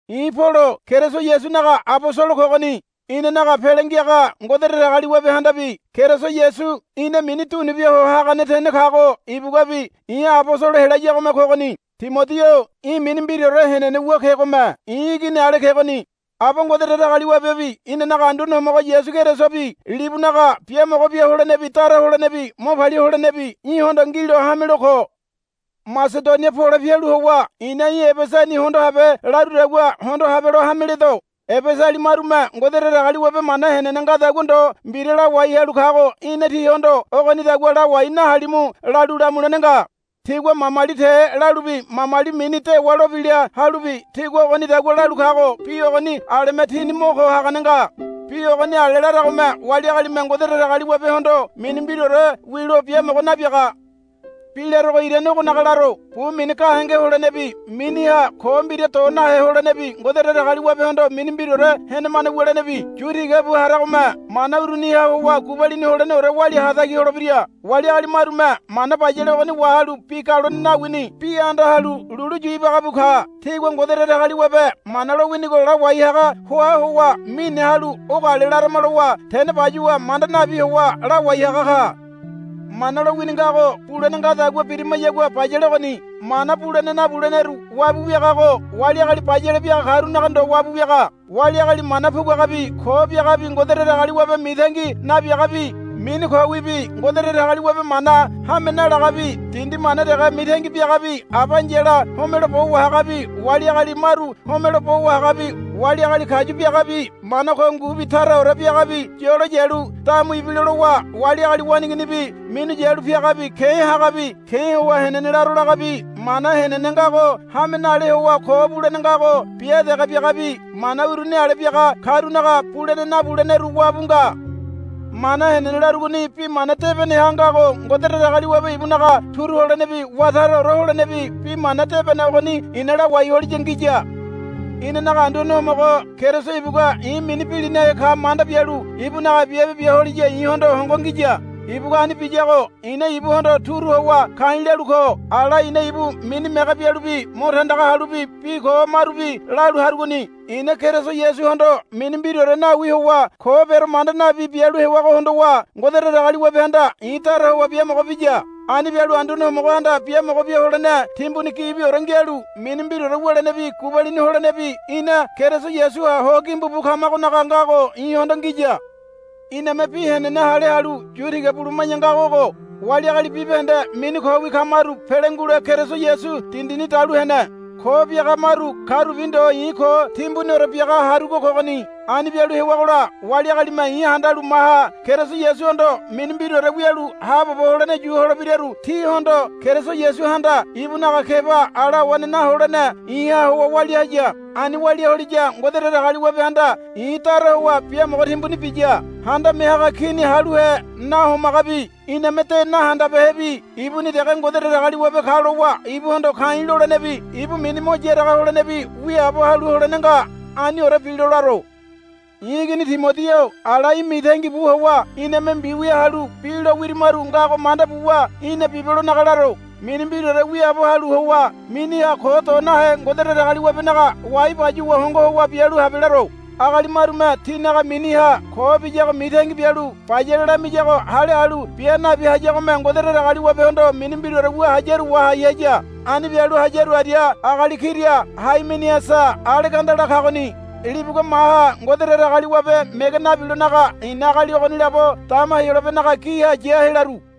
I̱ Polo Keriso Yasunaga abosolo kogoni. Inanaga Pele Ngiaga Ngode Datagaliwabehandabi Keriso Yasu ina mini dunubia ho hagane tene kago ibuguabi i̱ abosolo helayagome kogoni. Timodi-o í̠ mini mbiraore henene wu kegome i̱ igini ale kegoni. Aba Ngode Datagaliwabebi inanaga Anduane Homogo Keriso Yasubi libunaga biamogo bia holenebi dara holenebi mo palia holenebi í̠hondo ngilo hamelo ko. Masedonia pole pialu howa i̱na í̠ Ebesani hondo habe larudagua hondo habelo hame ledo. Ebesali marume Ngode Datagaliwabe mana henene ngadagua ndo mbira lawai halu kago í̠na tihondo, Ogonidagua lawai nahalimu, lalu lamulene nga. Tigua mamali te lalubi mamali mini dewa lo bila halubi tigua ogonidagua lalu kago bi ogoni aleme tini mo ko hagane nga. Bi ogoni ale laragome wali agalime Ngode Datagaliwabehondo mini mbiraore wilo biamogo nabiaga. Bi larogo irane ogonaga laro. Bu mini gahenge holenebi miniha ko mbira do nahe holenebi Ngode Datagaliwabehondo mini mbiraore henemane wulenebi yu tigabu haramagome mana uruniha howa gubalini holeneore walia hatagi holebira. Wali agali marume mana bayale ogoni wahalu bi galone nawini bi anda halu lulu yu ibaga bu ka. Tigua Ngode Datagaliwabe mana lowinigo lawai haga hoa howa mine halu ogo ale larama lowa tene bayuwa manda nabi howa lawai haga ka. Mana lowini ngago bulene ngadagua birimayagua bayale ogoni. Mana bulene nabuleneru wabu wiagago wali agali bayale biaga karunaga ndo wabu wiaga. Wali agali mana puguagabi ko biagabi Ngode Datagaliwabe mitangi nabiagabi mini kowibi Ngode Datagaliwabe mana hame nalagabi dindi mana dege mitangi biagabi aba ai̱yala homelo bo wahagabi wali agali maru homelo bo wahagabi wali agali kayu biagabi mana ko ngubi taraore biagabi yolo yalu damu ibilo lowa wali agali waneiginibi minu yalu piagabi ke̱ hagabi ke̱ howa henene laro lagabi mana henene ngago hame nale howa ko bulene ngago bia dege biagabi mana uruni ale biaga karunaga bulene nabuleneru wabu nga. Mana henene larugoni bi mana debeneha ngago Ngode Datagaliwabe ibunaga turu holenebi wá taraore holenebi Bi Mana Debene ogoni i̱na lawai holiya ngiya. Inanaga Anduane Homogo Keriso ibugua i̱ mini bilinahe ka manda bialu ibunaga biabe bia holiya i̱hondo hongo ngiya. Ibugua ani biyago i̱na ibuhondo turu howa ka̱i̱ lalu ko. Ala i̱na ibu mini mege bialubi mo tandaga halubi bi ko marubi lalu harugoni. I̱na Keriso Yasuhondo mini mbiraore nawi howa ko bero manda nabi bialu hewago hondowa Ngode Datagaliwabehanda i̱ dara howa biamogo biya. Ani bialu Anduane Homogohanda biamogo bia holene timbuni gibiore ngialu mini mbiraore wulenebi gubalini holenebi ina Keriso Yasuha ho gimbu bu kamagonaga ngago i̱hondo ngiya. Iname bi henene hale halu yu tiga buluma̱ya ngago ogo. Wali agali bibahende mini kowi kamaru pele ngule Keriso Yasu dindini dalu hene. Ko biaga maru karubi ndo i̱ ko timbuniore biaga harugo kogoni. Ani bialu hewagola wali agalime i̱ handalu maha Keriso Yasuhondo mini mbiraore wialu haabobo holene yu holebiraru tihondo Keriso Yasuhanda ibunaga keba ala awane naholene i̱ha howa walia haya. Ani walia holiya Ngode Datagaliwabehanda i̱ dara howa biamogo timbuni biya. Handame Haga Kini haluhe nahomagabi iname de nahandabehebi ibuni dege Ngode Datagaliwabe ka lowa ibuhondo ka̱i̱ lolenebi ibu mini mo yaraga holenebi wiaabo halu holene nga. Aniore bilo laro. I̱ igini Timodi-o ala í̠ mitangi bu howa iname mbiwia halu bi lo wirimaru ngago manda buwa í̠na bibelonaga laro. Mini mbiraore wiaabo halu howa miniha ko do nahe Ngode Datagaliwabenaga wai bayuwa hongo howa bialu habe laro. Agali marume tinaga miniha ko biyago mitangi bialu bayale lamiyago hale halu bia nabi hayagome Ngode Datagaliwabehondo mini mbiraore wu hayaru wahai haya. Ani bialu hayaru aria agali kira Haimeniasa Alegandala kagoni. Libugua maha Ngode Datagaliwabe mege nabilonaga i̱na agali ogoni labo dama Heyolabenaga giha ya helaru.